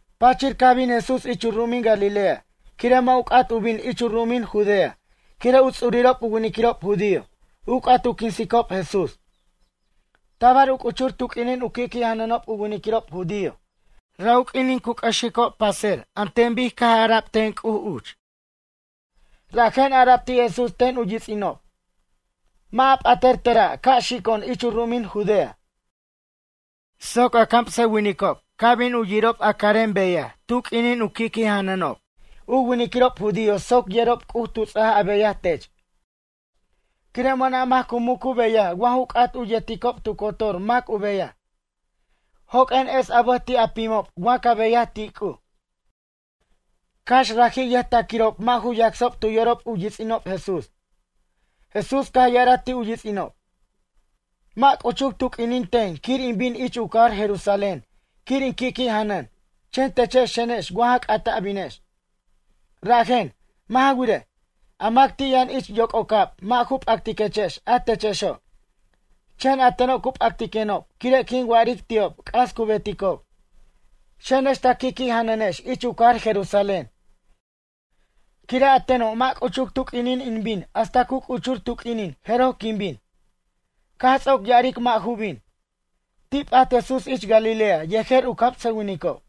Pachir caj bin Jesús ich u ru'umin Galilea quire' mʌ' u c'at u bin ich u ru'umin Judea quire' u ts'urirob u winiquirob judío u c'at u quinsicob Jesús. Tabar u c'uchur tu q'uinin u qui' janʌnob u winiquirob judío ra' u q'uinin cu c'ʌxicob paser an ten bic ara'b ten C'uj uch. Rajen ara'b ti' Jesús ten u yits'inob: ―Mʌ' a p'atʌr tera' ca' xico'on ich u ru'umin Judea. Soc a camsʌwinicob ca' bin u yirob a carem beyaj tu q'uinin u qui'qui' janʌnob u winiquirob judío soc yerob C'uj tu ts'aj a beyaj tech. Quire' mʌna' mac cu muc u beyaj wa ju c'at u yeticob tu cotor mac u beyaj. Joq'uen es a bʌj ti' a pimob wa ca beyaj ti' C'uj. Cax raji' yʌjtaquirob mʌ' ju yacsob tu yorob u yits'inob Jesús. Jesús caj ya'araj ti' u yits'inob: ―Mʌ' c'uchuc tu q'uinin ten quir in bin ich u cajar Jerusalén quir in qui'qui'janʌn. Chen techex xenex wa ja c'at a binex. Rajen, mʌ' ja wirej, a mac ti' yʌn ich yoc'ocab mʌ' ju p'actiquechex a techexo', chen a teno' cu p'actiquenob quire' quin wa'aric ti'ob c'as cu beticob. Xenex ta qui'qui' janʌnex ich u cajar Jerusalén. Quire' a teno' mʌ' c'uchuc tu q'uinin in bin hasta cu c'uchur tu q'uinin jeroj quin bin. Caj ts'oc ya'aric mʌ' ju bin, ti' p'at Jesús ich Galilea yejer u camsʌwinicob.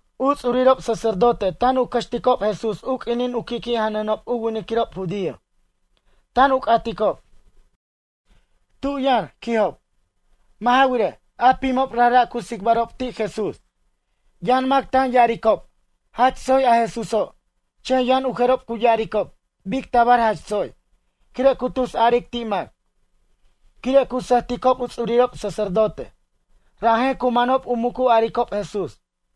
U ts'urirob sacerdote tan u cʌxticob Jesús u q'uinin cu qui'qui' janʌnob u winiquirob judío. Tan u c'aticob: ―Tu' yʌn? ―quijob. Mʌ' ja wirej, a pimob rajra' cu tsicbarob ti' Jesús. Yʌn mac tan ya'aricob: “Jach tsoy a Jesúso'.” Chen yʌn u jerob cu ya'aricob: “Bic tabar jach tsoy. Quire' cu tusaric ti' mac.” Quire' cu sʌjticob u ts'urirob sacerdote. Rajen cu manob u muc u aricob Jesús.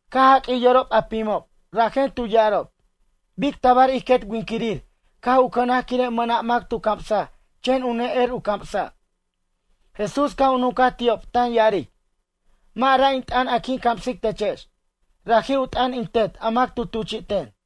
Caj jaq'uij yorob a pimob, rajen tu ya'arob: ―Bic tabar ij quet winquirir caj u cʌnaj quire' mʌna' mac tu camsaj chen u ne'er u camsa'? Jesús caj u nuncaj ti'ob tan ya'aric: ―Mʌ' ra' in t'ʌn a quin camsic techex. Raji' u t'ʌn in Tet a mac tu tuchi'ten.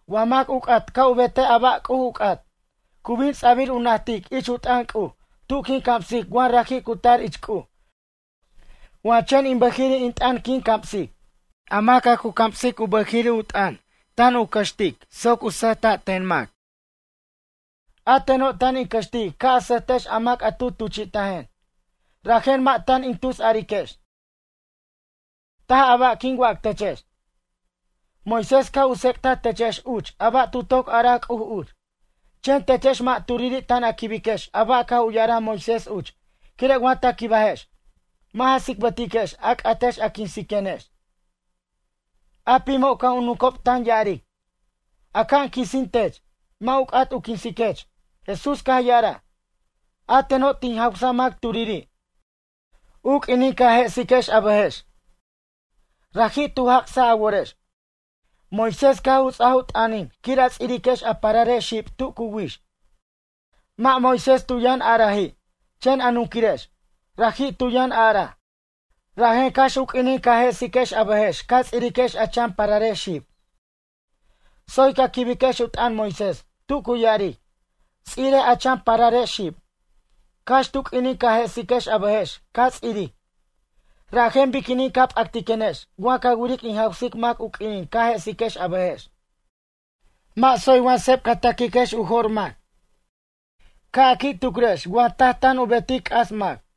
Wa mac u c'at ca' u betej a ba' C'uj u c'at. Cu bin ts'abir u najtic ich u t'ʌn C'uj tu' quin camsic wa raji' cu tar ich C'uj wa chen in bʌjiri' in t'ʌn quin camsic. A mac a cu camsic u bʌjiri' u t'ʌn tan u cʌxtic soc sʌjta' ten mac. A teno' tan in cʌxtic ca' a sʌjtex a mac a tu tuchi'tajen. Rajen mʌ' tan in tusariquex, taj a ba' quin wac techex. ’Moisés caj u tsec'taj techex uch a ba' tu toc araj C'uj uch. Chen techex mʌ' turiri' tan a quibiquex a ba' caj u ya'araj Moisés uch quire' wa ta quibajex, mʌ' ja tsicbʌtiquex a c'atex a quinsiquenex. A pimob caj u nuncob tan ya'aric: ―Aca'an quisin tech, mac u c'at u quinsiquech? Jesús caj ya'araj: ―A teno' tin jawsa mac turiri', u q'uinin ca jesiquex a bʌjex, raji' tu jac'saj a worex. Moisés caj u ts'aj u t'ʌnin quir a ts'iriquex a pararex xib tu cu wix. Mʌ' Moisés tu yʌn a'raji', chen a nunquirex, raji' tu yʌn a'raj. Rajen cax u q'uinin ca jesiquex a bʌjex ca ts'iriquex a chan pararex xib. Tsoy ca' quibiquex u t'ʌn Moisés tu cu ya'aric: “Ts'irej a chan pararex xib.” Cax tu q'uinin ca jesiquex a bʌjex ca' ts'iric. Rajen biquinin ca p'actiquenex ca wiric in jawsic mac u q'uinin ca jesiquex a bʌjex. Mʌ' tsoy wa sep ca ta'quiquex u jo'r mac. Ca' a qui' tucrex wa taj tan u betic c'as mac.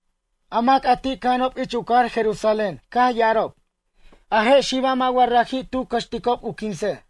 A mac a ti' cʌja'anob ich u cajar Jerusalén caj ya'arob: ―A je' xiba' mʌ' wa raji' tu cʌxticob u quinsej.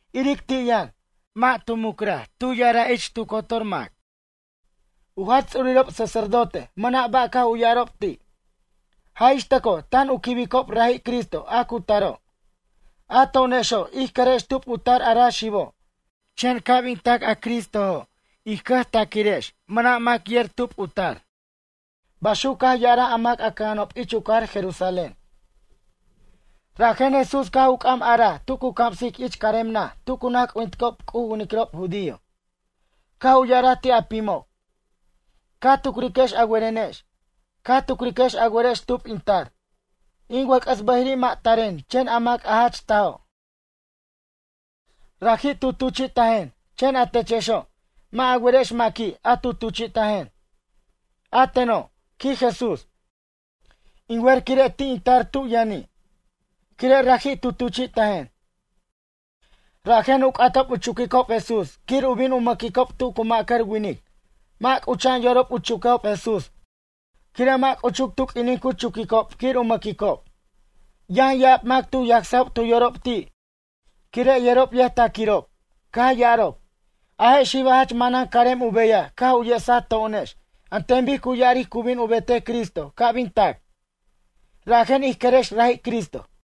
Iric ti' yʌn. Mʌ' tu mucra'r tu ya'araj ich tu cotor mac. U jach ts'urirob sacerdote mʌna' ba' caj u ya'arob ti'. Jaj ix tʌco' tan u quibicob raji' Cristo a cu taro'. A to'onexo' ij querex tub u tar a ra xibo'. Chen ca' bin tac a Cristojo' ij cʌjtaquirex mʌna' mac yer tub u tar ―baxuc caj ya'araj a mac cʌja'anob ich u cajar Jerusalén. Rajen Jesús caj u c'am araj tu cu camsic ich carem naj tu cu naj c'ujinticob C'uj u winiquirob judío. Caj u ya'araj ti' a pimob: ―Ca tucriquex a werenex. Ca tucriquex a werex tub in tar. In wʌc'ʌs bʌjiri' mʌ' taren chen a mac jach tajo', raji' tu tuchi'tajen. Chen a techexo', mʌ' a werex maqui' a tu tuchi'tajen. A teno' ―quij Jesús―, in wer quire' ti' in tar tub yʌni'. Quire' raji' tu tuchi'tajen. Rajen u c'atob u chuquicob Jesús quir u bin u mʌquicob tu cu ma'cʌr winic. Mʌ' c'ucha'an yorob u chuquejob Jesús quire' mʌ' c'uchuc tu q'uinin cu chuquicob quir u mʌquicob. Yʌn ya'ab mac tu yacsob tu yorob ti' quire' yerob yʌjtaquirob. Caj ya'arob: ―A je' xibo' jach manan carem u beyaj caj u yesaj to'onex an ten bic cu ya'aric cu bin u betej Cristo ca' bin tac. Rajen ij querex raji' Cristo.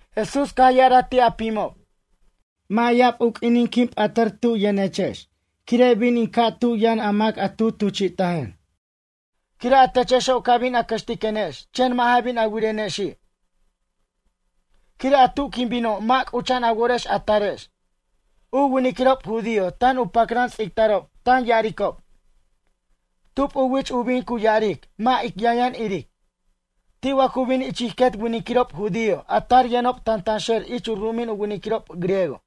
Jesús caj ya'araj ti' a pimob: ―Mʌ' ya'ab u q'uinin quin p'atʌr tub yʌnechex quire' bin in ca' tub yʌn a mac a tu tuchi'tajen. Quire' a techexo' ca bin a cʌxtiquenex chen mʌ' ja bin a wirenexi'. Quire' a tu quin bino' mʌ' c'ucha'an a worex a tarex. U winiquirob judío tan u pacran tsicbarob tan ya'aricob: ―Tub u wich u bin cu ya'aric mʌ' ic yʌnyʌn iric? Ti' wa cu bin ich ij quet winquirirob judío a tar yʌnob tantanxer ich u ru'umin u winiquirob griego?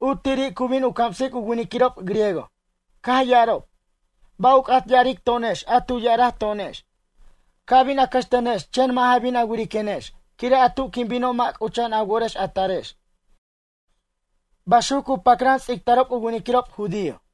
U tiri' cu bin u camsic u winiquirob griego. Caj ya'arob: ―Ba' u c'at ya'aric to'onex a tu ya'araj to'onex: “Ca bin a cʌxtenex chen mʌ' ja bin a wiriquenex quire' a tu quin bino' mʌ' c'ucha'an a worex a tarex”? ―baxuc cu pacran tsicbarob u winiquirob judío.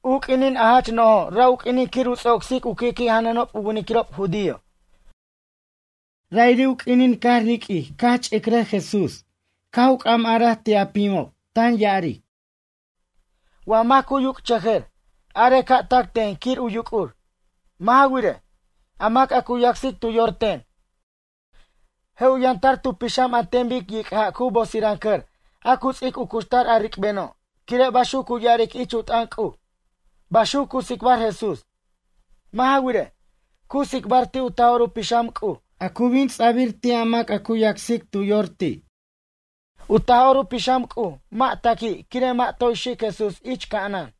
U q'uinin a jach no'jo' ra' u q'uinin quir u ts'ocsic u qui'qui' janʌnob u winiquirob judío. Ra'iri' u q'uinin caj riq'uij caj ch'icrʌj Jesús caj u c'am araj ti' a pimob, tan ya'aric: ―Wa mac cu yuc'chʌjʌr, arej ca' tac ten quir u yuc'ur. Mʌ' ja wirej, a mac a cu yacsic tu yor ten, je' u yʌn tar tu pixam an ten bic yic' ja' cu bosirancʌr a cu ts'ic u cuxtar a ricbeno' quire' baxuc cu ya'aric ich u t'ʌn C'uj ―baxuc cu tsicbar Jesús. Mʌ' ja wirej, cu tsicbar ti' u Taj'or u Pixam C'uj a cu bin ts'abir ti' a mac a cu yacsic tu yor ti'. U Taj'or u Pixam C'uj mʌ' taqui' quire' mʌ' toy xic Jesús ich ca'anan.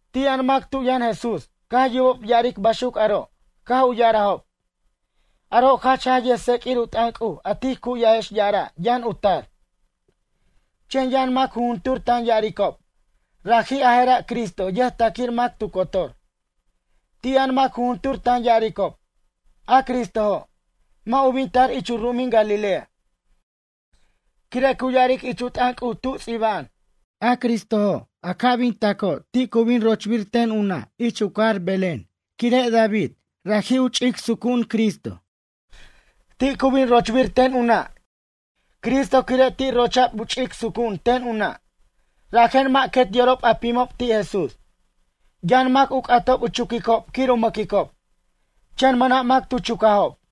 Ti' yʌn mac tu' yʌn Jesús caj yubob ya'aric baxuc aro' caj u ya'arajob: ―Aro' jach jaj yʌjtseq'uir u t'ʌn C'uj a tij cu'yajex ya'ara' yʌn u tar. Chen yʌn mac jujuntur tan ya'aricob: ―Raji' a jera' Cristo yʌjtaquir mac tu cotor. Ti' yʌn mac jujuntur tan ya'aricob: ―A Cristojo', mʌ' u bin tar ich u ru'umin Galilea. Quire' cu ya'aric ich u t'ʌn C'uj tu' ts'iba'an: “A Cristojo' a ca' bin taco' ti' cu bin rochbir ten u nʌ' ich u cajar Belén quire' David, raji' u ch'ic sucu'un Cristo. Ti' cu bin rochbir ten u na' Cristo quire' ti' rocha'b u ch'ic sucu'un ten u na'.” Rajen mʌ' quet yorob a pimob ti' Jesús. Yʌn mac u c'atob u chuquicob quir u mʌquicob. Chen mʌna' mac tu chucajob.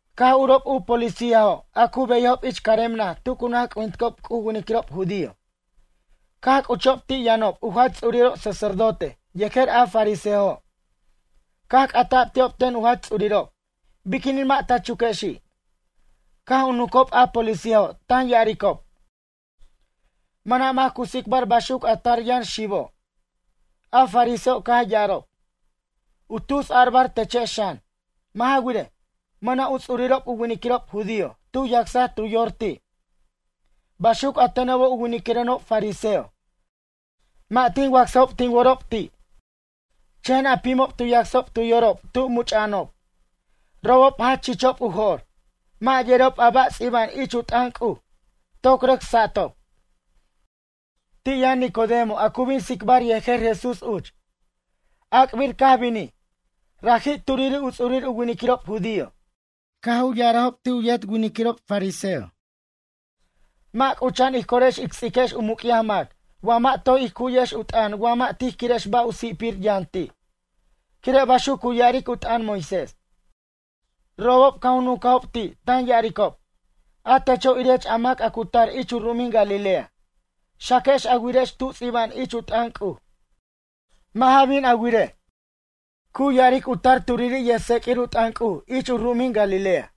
Caj urob a policíajo' a cu beyajob ich carem naj tu cu naj c'ujinticob C'uj u winiquirob judío. Caj c'uchob ti' yʌnob u jach ts'urirob sacerdote yejer a fariseojo'. Caj c'ata'b ti'ob ten u jach ts'urirob: ―Biquinin mʌ' ta chuquexi'? Caj u nuncob a policíajo' tan ya'aricob: ―Mʌna' mac cu tsicbar baxuc a tar yʌn xibo'. A fariseojo' caj ya'arob: ―U tus a'bar techex xan? Mʌ' ja wirej, mʌna' u ts'urirob u winiquirob judío tu yacsaj tu yor ti'. Baxuc a tenobo' u winiquirenob fariseo, mʌ' tin wacsajob tin worob ti'. Chen a pimob tu yacsob tu yorob tub much'a'anob. Robob jach chichob u jo'r. Mʌ' yerob a ba' ts'iba'an ich u t'ʌn C'uj, toc rʌc satob. Ti' yʌn Nicodemo a cu bin tsicbar yejer Jesús uch. Ac'bir caj binij. Raji' turiri' u ts'urir u winiquirob judío. Caj u ya'arajob ti' u yet winiquirob fariseo: ―Mʌ' c'ucha'an ij corex ic ts'iquex u muc'yaj mac wa mʌ' toy ij cu'yex u t'ʌn wa mʌ' tij quirex ba' u si'pir yʌn ti', quire' baxuc cu ya'aric u t'ʌn Moisés. Robob caj u nuncajob ti' tan ya'aricob; ―A techo' irech a mac a cu tar ich u ru'umin Galilea. Xaquej a wirej tu' ts'iba'an ich u t'ʌn C'uj. Mʌ' ja bin a wirej, cu ya'aric u tar turiri' yʌjtseq'uir u t'ʌn C'uj ich u ru'umin Galilea.